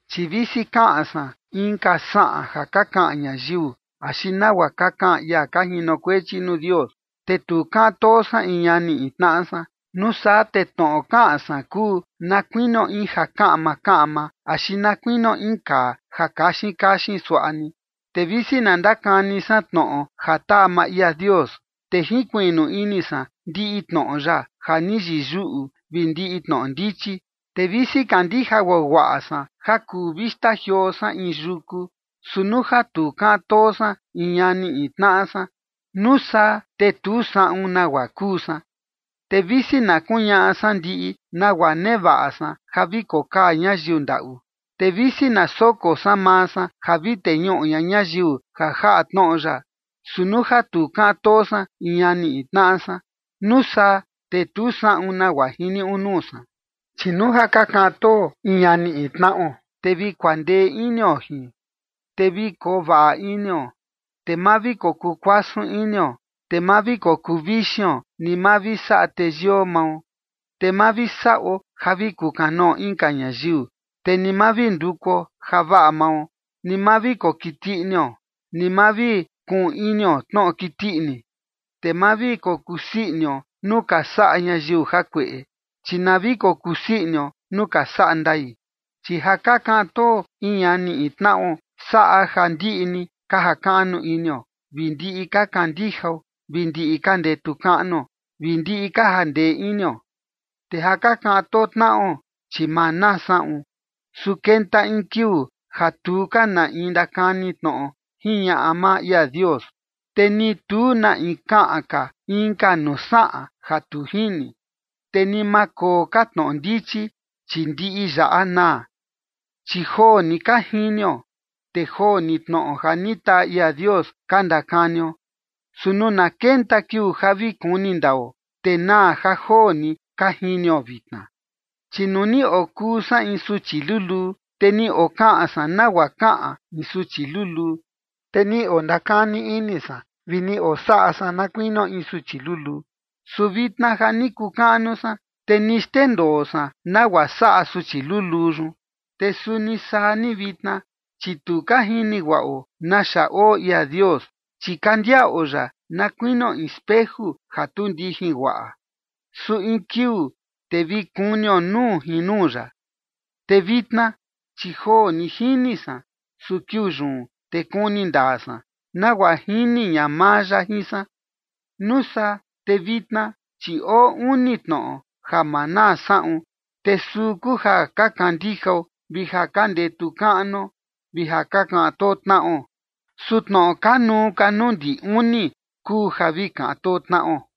Chi visi kaꞌan san inka saꞌan ja ka kaꞌan ñayiu axi nagua ka kaꞌan ia ka jinokuechi nuu Dios, te tu kaꞌan too san in ñani in tnaꞌa san, nuu saa te tnoꞌo kaꞌan san kuu na kuinio in ja kaꞌma kaꞌma axi na kuinio in kaa ja kaxin kaxin suaꞌa ni. Te visi na ndakani san tnoꞌo ja taa maa ia Dios, te jinkuiꞌnu ini san ndiꞌi tnoꞌo ya ja ni yiyuꞌu vi ndiꞌi tnoꞌo ndichi, te visi kandija guaguaꞌa san ja vi kuu xtajioo san in yuku, su nuu ja tu kaꞌan too san in ñani in tnaꞌa san, nuu saa te tu saꞌun nagua kuu san. Te visi na kuñaꞌa san ndiꞌi nagua nevaꞌa san ja vi kokaa ñayiu ndaꞌu, te visi na soko san maa san ja vi teñuꞌu ña ñayiu ja jaꞌa tnoꞌo ya, su nuu ja tu kaꞌan too san in ñani in tnaꞌa san, nuu saa te tu saꞌun nagua jiniuꞌu nuu san. Chi nuu ja ka kaꞌan too in ñani in tnaꞌo, te vi kuandee inio jin, te vi kovaꞌa inio, te ma vi kokuu kuasun inio, te ma vi kokuu vixion, ni ma vi saꞌa teyio mao, te ma vi saꞌo ja vi kukanoo inka ñayiu, te ni ma vi ndukuo javaꞌa mao, ni ma vi kokiti inio, ni ma vi kuꞌun inio tnoꞌo kiti ini. Te ma vi kokusii inio nuu ka saꞌa ñayiu jakueꞌe, chi na vi kokusii inio nuu ka saꞌa ndai. Chi ja ka kaꞌan too in ñani in tnaꞌo saꞌa ja ndiꞌi ni ka jakaꞌnu inio, vi ndiꞌi ka kandijao, vi ndiꞌi ka ndetu kaꞌnuo, vi ndiꞌi ka jandee inio. Te ja ka kaꞌan too tnaꞌo, chi ma naa saꞌun. Su kenta in kiuu ja tu ka na in ndakani tnoꞌo jiñaꞌa maa ia Dios, te ni tu na in kaꞌan ka inka nuu saꞌan ja tu jini, te ni ma koo ka tnoꞌo ndichi, chi ndiꞌi yaꞌa naa. Chi joo ni ka jinio, te joo ni tnoꞌo ja ni taa ia Dios ka ndakanio. Su nuu na kenta kiuu ja vi kuni ndao, te naa ja joo ni ka jinio vitna. Chi nuu ni okuu san in suchi luluu, te ni okaꞌan san nagua kaꞌan in suchi luluu, te ni ondakani ini san vi ni osaꞌa san na kuinio in suchi luluu. Su vitna ja ni kuu kaꞌnu san, te ni xndendoo san nagua saꞌa suchi luluu yun. Te suni saa ni vitna, chi tu ka jini guaꞌo naxa oo ia Dios, chi ka ndiaꞌo ya na kuinio in speju ja tu ndijin guaꞌa. Su in kiuu te vi kunio nuu jin nuu ya. Vitna, chi joo ni jini san, su kiuu yun, te kuni ndaa san, nagua jini ña maa ya jin san. Nuu saa te vitna, chi oo uni tnoꞌo ja ma naa saꞌun, te suu kuu ja ka kandijao, vi ja ka ndetu kaꞌnuo vi ja ka kaꞌan too tnaꞌo. Su tnoꞌo kanuu ka nuu ndi uni kuu ja vi kaꞌan too tnaꞌo.